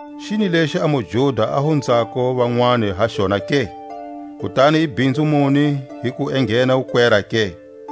Xini lexi a muJuda a hunzako vanwani ha xona ke? kutani i bhinzu muni hi ku enghena wukwera ke?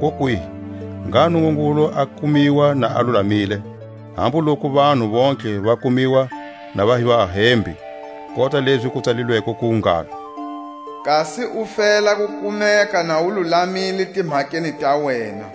Kokwihi! Ngha Nungungulu a kumiwa na a lulamile, hambu loku vanhu vontlhe va kumiwa na va hi vahembi; kota lezi ku tsalilweko ku ngalo: Kasi u fela ku kumeka na u lulamile timhakeni ta wena,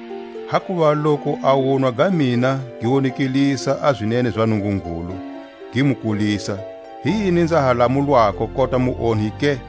Hakuva loku a wunwa ga mina gi wonekelisa a zinene za Nungungulu gi mu kulisa, hi yini nza ha lamulwako kota muonhi ke?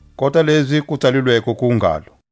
Kota lezi ku tsalilweko ku ngalo: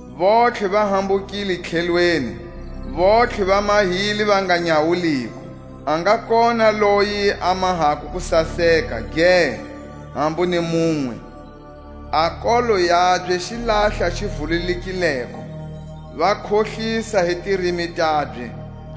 Vontlhe va hambukile tlhelweni, vontlhe va mahile va nga nyawuliko; A nga kona loyi a mahako kusaseka, ge hambu ni munwe. A nkolo wabye xilahla xi vululekileko; Va khohlisa hi tirimi tabye;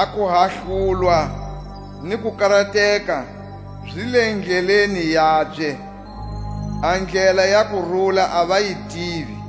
A kuhahlulwa ni kukarateka zi le tindleleni tabye. A ndlela ya kurula a va yi tivi.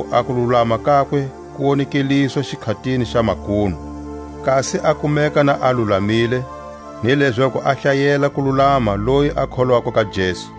lezaku a kululama kakwe ku wonekeliswa xikhatini xa makunu, kasi a kumeka na a lulamile, ni lezaku a hlayela kululama loyi a kholwako ka Jesu.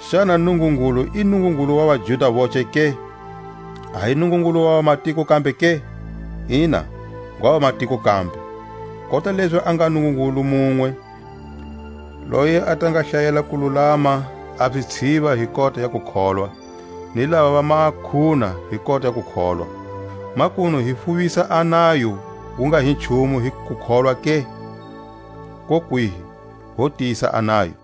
Xana Nungungulu i Nungungulu wa vaJuda voce ke? A hi Nungungulu wa vamatiko kambe ke? Ina, ngwa vamatiko kambe, kota lezi a nga Nungungulu munwe, loyi a ta nga hlayela kululama a zitshiva hi kota ya kukholwa, ni lavava makhuna hi kona kukholwa. Makunu hi fuvisa a nayo wu nga hi nchumu hi kukholwa ke? Kokwihi! ho tiyisa a nayo.